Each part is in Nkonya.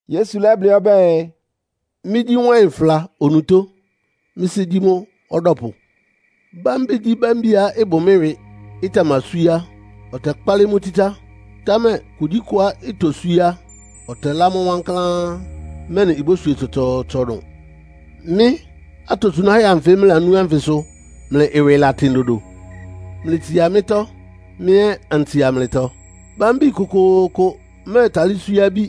Yesu lɛ́blɩ́ ɔbɛ́ɛ, “Mɩ́gyí wáɩn ɩfla onutó. Mɩ́ Sɩ́ gyí mʋ́ ɔdɔ́pʋ. Bámbigyíbámbiá ɩbʋ mɩ́ ɩwɩ, ɩtamaswíé á, ɔtɛkpálɩ́ mʋ́ tsítsá. Támɛ kugyíkʋá itoswíé á, ɔtɛlá mʋ́ wankláán, mɛ́nɩ ibóswie tsɔtsɔɔtsɔ dʋn. Mɩ́ atosunáhɛ́ anfɩ mlɩlanú ánfɩ sʋ mlɩ ɩwɩ latɩn dodo. Mlɩtsia mɩ́tɔ́, mɩ́ ɛ́ antsia mlɩtɔ. Bámbi kʋkʋʋkʋ mɛ́ɛtalɩ́ swíé abí,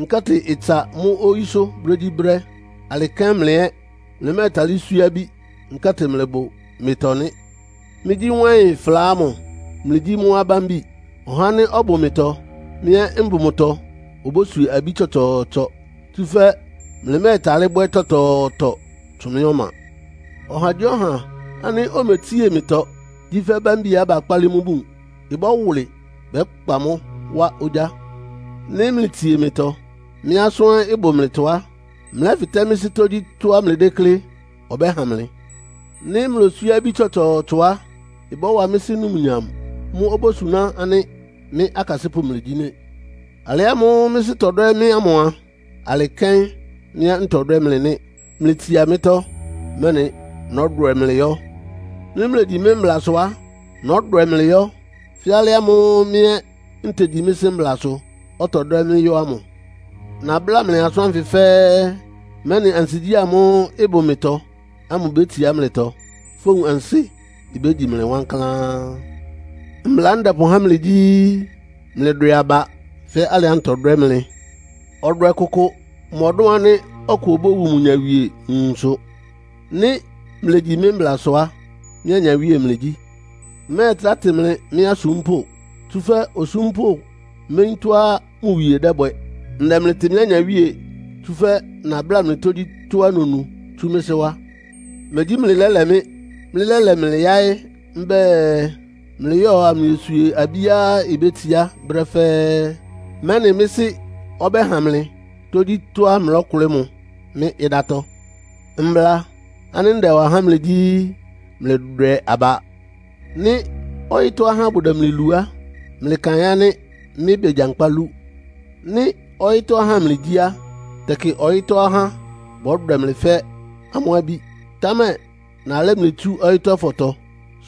nkɛ́tɩ ɩtsa mʋ́ oyísʋ́ brégyíbrɛ́. Alɩ kɛ́n mlɩ ɛ́ mlɩmɛ́ɛtalɩ́ swíé abí, nkɛ́tɩ mlɩbʋ mɩtɔ nɩ́. “Mɩ́gyí wáɩn ɩfla ámʋ. Mlɩgyí mʋ́ abámbi. Ɔhá ánɩ́ ɔbʋ mɩtɔ, mɩ́ ɛ́ mbʋ mʋtɔ obóswie abí tsɔtsɔɔtsɔ, tsúfɛ́ mlɩmɛ́ɛtalɩ́ bwɛ́ tɔtɔɔtɔ tsʋn mɩ́ ɔma. Ɔhagyíɔha ánɩ́ ometsie mɩtɔ gyí fɛ́ bámbiá bakpálɩ́ mʋ́ bun, ɩbɔ́wʋlɩ, bɛ́kpa mʋ́ wá ogyá. Nɩ́ mlɩtsie mɩtɔ, mɩ́ asʋ́n ɛ́ ɩbʋ mlɩtɔ á, mlɛ́fɩtɛ mɩ́ Sɩ́ tógyítɔ́á mlɩdéklé, ɔbɛ́ha mlɩ. Nɩ́ mloswíé abí tsɔtsɔɔtsɔ á, ɩbɔ́wa mɩ́ Sɩ́ numnyam. Mʋ́ obósuná ánɩ́ mɩ́ akasɩ́pʋ́ mlɩgyí nɩ́. Alɩ ámʋ́ʋ́ mɩ́ Sɩ́ tɔdwɛ́ mɩ́ ámʋ a, alɩ kɛ́n mɩ́ ɛ́ ntɔdwɛ́ mlɩ nɩ́. Mlɩtsia mɩ́tɔ́, mɛ́nɩ nɔ́dwɛ mlɩ yɔ́. Nɩ́ mlegyi mɩ́ mblasʋ á, nɔ́dwɛ mlɩ yɔ́, fɛ́ alɩ ámʋ́ʋ́ mɩ́ ɛ́ ntegyi mɩ́ Sɩ́ mblasʋ, ɔtɔdwɛ́ mɩ́ yɔ́ ámʋ. “Nabláa mlɩ asʋ́n ánfɩ fɛ́ɛ́, mɛ́nɩ ansigyí ámʋ́ʋ́ ɩbʋ mɩtɔ ámʋ bétsiá mlɩtɔ. Fówun ansɩ́ bégyi mlɩ wankláán. Mbla ánɩ́ ndɛpʋhá mlɩ gyí; mlɩdwɛ aba fɛ́ alɩá ntɔdwɛ́ mlɩ. Ɔdwɛ kʋkʋ mɔdʋ́n ánɩ́ ɔkʋ obówu mʋ nyawie nwunsʋ. Nɩ́ mlegyi mɩ́ mblasʋ á, mɩ́ anyawíe mlɩgyí. Mmɛ́ɛtrá tɩ mlɩ mɩ́ asúmpʋ́. Tsúfɛ́ osúmpʋ́ méyín tɔ́á mʋ wie dɛ́bwɛ. Ndɛ mlɩtɩ mɩ́ anyawíe, tsúfɛ́ nabláa mlɩ tógyítɔ́á nonu tsú mɩ́ Sɩ́ wá. Megyí mlɩ lɛ́lɛ mɩ́. Mɩ́lɛ́lɛ mlɩ yáɩ́ mbɛ́ɛ, mlɩyɔ́ɔ amlɩyoswie abíá ibétsiá brɛ́ fɛ́ɛ́, mɛ́nɩ mɩ́ Sɩ́ ɔbɛ́ha mlɩ tógyítɔ́á mlɔ́kʋlɩ́ mʋ mɩ́ ɩdátɔ́. Mbla ánɩ́ ndɛwa há mlɩ gyí, ‘Mlɩdwɛ aba.’ “Nɩ́ ɔyɩ́tɔ́ ahá bʋdɛ mlɩ lu á, mlɩkaɩn ánɩ́ mɩ́ begyankpá lú. Nɩ́ ɔyɩ́tɔ́ ahá mlɩgyí a, tɛkɩ ɔyɩ́tɔ́ ahá bɔ́dwɛ mlɩ fɛ́ amʋ́ abí. Támɛ nalɛ́ mlɩ tsú ɔyɩ́tɔ́fɔtɔ,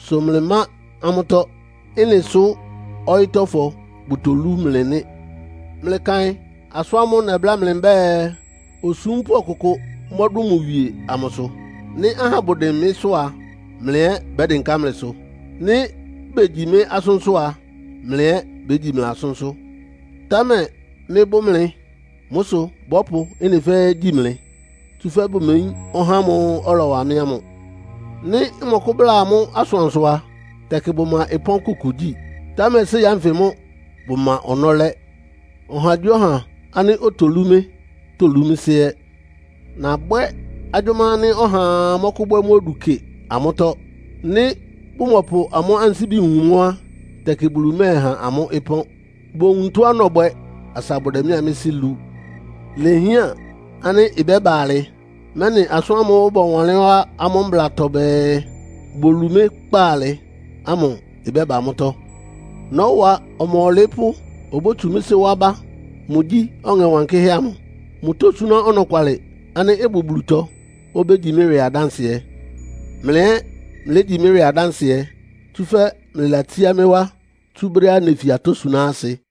sʋ mlɩmá amʋ́tɔ́. Ɩ́nɩ sʋ ɔyɩ́tɔ́fɔ bʋtolú mlɩ nɩ́. Mlɩkaɩn asʋ́n ámʋ́ʋ́ nɛbláa mlɩ mbɛ́ɛ, ‘Osúmpʋ́ ɔkʋkʋ mɔ́dʋn mʋ wie’ amʋsʋ. Nɩ́ ahá bʋdɩn mɩ́sʋ́ a, mlɩ ɛ́ bɛ́dɩnká mlɩsʋ. Nɩ́ begyi mɩ́ asʋ́nsʋ́ á, mlɩ ɛ́ bégyi mlɩ asʋ́nsʋ́. Támɛ mɩ́bʋ́ mlɩ, sʋ bɔ́pʋ ɩ́nɩ fɛ́ɛ́ gyi mlɩ, tsúfɛ́ bʋmeyín ɔhá ámʋ́ʋ́ ɔlɔwa mɩ́ ámʋ. Nɩ́ mmɔkʋ́bláa amʋ́ asʋansʋ á, tɛkɩ bʋma ɩpɔ́n kʋkʋ gyí. Támɛ séi ánfɩ mʋ́ bʋma ɔnɔ́ lɛ́. Ɔhagyíɔha ánɩ́ otolú mɩ́ tolú mɩ́ Sɩ́ ɛ́. Nabɔbwɛ agyʋ́má ánɩ́ ɔhaa mɔ́kʋ́bwɛ́ mʋ́ odu kɩ amʋ́tɔ́. Nɩ́ bʋmɔpʋ amʋ́ ansíbi wun mʋ́ á, tɛkɩ Bulu mɛ́ɛha amʋ́ ɩpɔ́n. Bowun tɔ́á nɔbwɛ asa bʋdɛ mɩ́a mɩ́ Sɩ́ lu. Ilehián ánɩ́ ɩbɛ́ba alɩ, mɛ́nɩ asʋ́n ámʋ́ʋ́ bɔwanlɩ́n wá amʋ́ Mblatɔ bɛɛ, ‘Bolu mɩ́ kpaalɩ’ ámʋ ɩbɛ́ba mʋ́tɔ́. “Nɔ́wa Ɔma Ɔlɩɩ́pʋ́ obótsu mɩ́ Sɩ́ wá bá. Mʋgyí Ɔŋɛ Wankɩ́hɛ́ amʋ. Mʋtósúná ɔnɔkwalɩ ánɩ́ ɩbʋ Bulutɔ. Obégyi mɩ́ ɩwɩ adánsɩɛ. Mlɩ ɛ́ mlégyi mɩ́ ɩwɩ adánsɩɛ, tsúfɛ́ mlɩlatsíá mɩ́ wá tsú brɛ́á nefi atɔ́ suná asɩ.